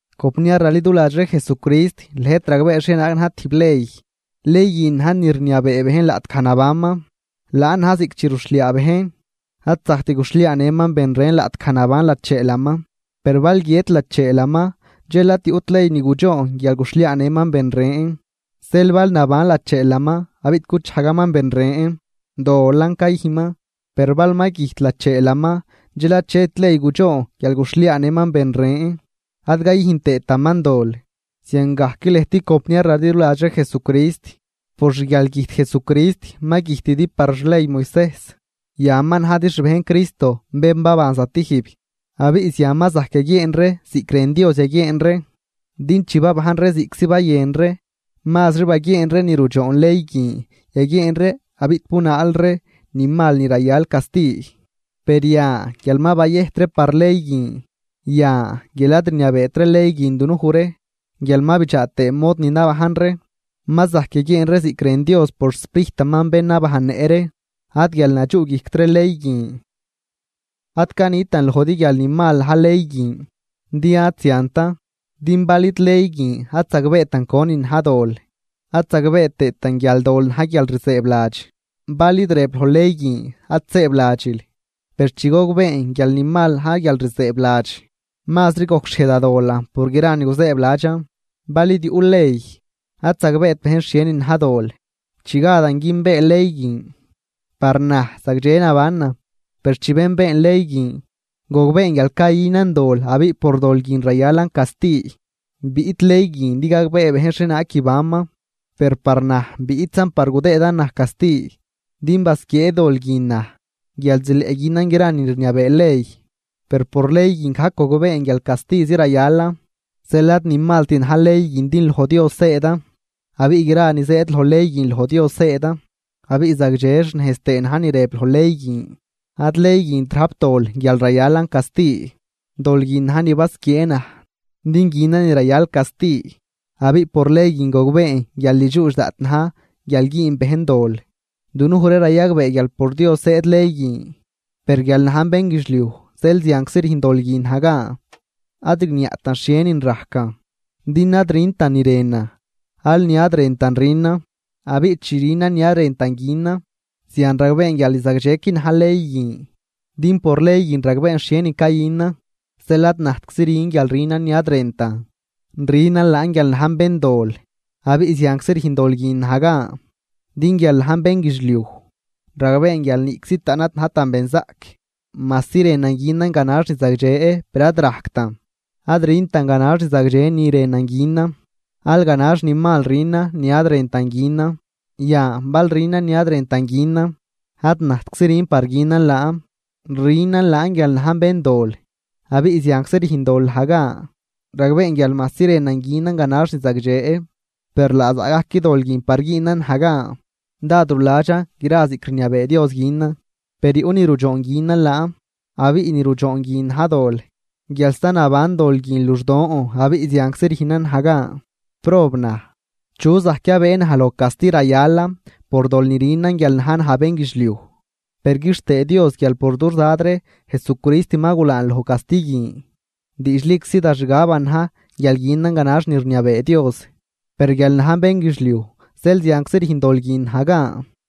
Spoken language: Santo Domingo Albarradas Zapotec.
Compniar raliduladx ree Jesucrist, lëjt ragbee xhienaag na̱j tijb ley. Ley guin na̱j ni rniabee bejn laꞌtgaj nabanman. Laan na̱j ziꞌc chi ruxhliaa bejn, ad zajct guxhliaanëman ben ren laꞌtgaj naban lacheelaman. Per bal guiët lacheelaman dxel ad yuꞌt ley ni gudxoon guial guxhliaanëman ben ren. Zeel bal naban lacheelaman abiꞌ guchajgaman ben ren, dolan cayüjnman. Per bal ma güjt lacheelaman dxel achet ley gudxoon guial guxhliaanëman ben ren ad cayüjn tëëtaman dol. Ziangajcan lëjt compniar raliduladx ree Jesucrist, por xguialgüjt Jesucrist ma güjtidi par xley Moisejs. Yan ma najdi xbejn Cristo bén baban zatijb, abiꞌ zian ma zajc yaguieen ree ziꞌc rën Dios yaguieen ree. Din chi babajn ree ziꞌctzi bayën ree, mazri baguieen ree ni rudxoon ley guin yaguieen ree abiꞌ bunaal ree ni mal ni rayal casti. Per yan guial ma bayëjt ree par ley guin, yan guial ad rniabeetri ley guin dunuj ree guial ma bidxaa tëë mod ni nabajn ree, ma zajc yaguieen ree ziꞌc rën Dios por xSprijtaman bén nabajnnëꞌ ree, ad guial nadxuꞌguijct ree ley guin. Ad canitan lojdi guial ni mal na̱j ley guin, din ad ziantan. Din bal id ley guin ad zagbeetan conin na̱j dol, ad zagbee tëëtan guial dol na̱j guialrzëëbladx, bal id rëb loj ley guin: “Ad sëëbladxil.” Per chi gogbeen guial ni mal na̱j guialrzëëbladx, mazri gojcxhiej da dolan por gra ni guzëëbladxan. Bal id yuꞌ ley, ad zagbeet bejn xhienin na̱j dol. Chi gadan günbee ley guin, par naj zagdxe nabanan. Per chi benbeen ley guin, gogbeen guial cayünan dol abiꞌ por dol guin rayalan casti. Biꞌt ley guin din gagbee bejn xhienaag guibanman, per par naj biꞌtzan par gudëëdan naj casti. Din basquiee dol guin naj guial zileꞌ günan gra ni rniabee ley, per por ley guin gajc gogbeen guial castizi rayalan. Zeel ad ni malt na̱j ley guin din loj Dios zëëdan abiꞌ gra ni zëëd loj ley guin loj Dios zëëdan, abiꞌ zagdxe xnejz tëë na̱j ni rëb loj ley guin. Ad ley guint rajp dol guial rayalan casti, dol guinan na̱j ni basquiee naj din günan ni rayal casti. Abiꞌ por ley guin gogbeen guial ni dxuudx daꞌt na̱j guial güün bejn dol. Dunuj ree rayagbee guial por Dios zëëd ley guin, per guial najn bénguidxliuj zeel zianczi rüjn dol guin naj gan. Ad rigniaꞌtan xhienin rajcan, din ad rüntan ni rënan, aal ni ad rëntan rünan. Abiꞌ chi rünan ni ad rëntan günan, zian ragbeen guial ni zagdxequi na̱j ley guin, din por ley guin ragbeen xhienin cayünan. Zeel ad najtczi rün guial rünan ni ad rëntan, rünan laan guial najn béndol, abiꞌ zianczi rüjn dol guin naj gan. Din guial najn bénguidxliuj, ragbeen guial niꞌczi taꞌn ad najtan benzaꞌc, majsi rënan günan ganax ni zagdxe, per ad rajctan. Ad rüntan ganax ni zagdxe ni rënan günan, aal ganax ni mal rünan ni ad rëntan günan. Yan bal rünan ni ad rëntan günan, ad najtczi rün par günan laan, rünan laan guial najn béndol abiꞌ zianczi rüjn dol naj gan. Ragbeen guial majsi rënan günan ganax ni zagdxe, per laa zaꞌ gajc dol guin par güünan naj gan. Dád ruladxan gra ziꞌc rniabee Dios günan, per yuꞌ ni rudxoon günan laan, abiꞌ ni rudxoon guin na̱j dol, guial sta naban dol guin luxdon abiꞌ zianczi rüjnan naj gan. ¡Prob naj! ¿Chu zajc yabëë naj loj casti rayalan por dol ni rünan guial na̱j naj bénguidxliuj? Per quixtëë Dios guial por dux Dad ree Jesucrist ma gulaan loj casti guin. Diidxliczi da xgaban na̱j guial günan ganax ni rniabee Dios, per guial najn bénguidxliuj zeel zianczi rüjn dol guin naj gan.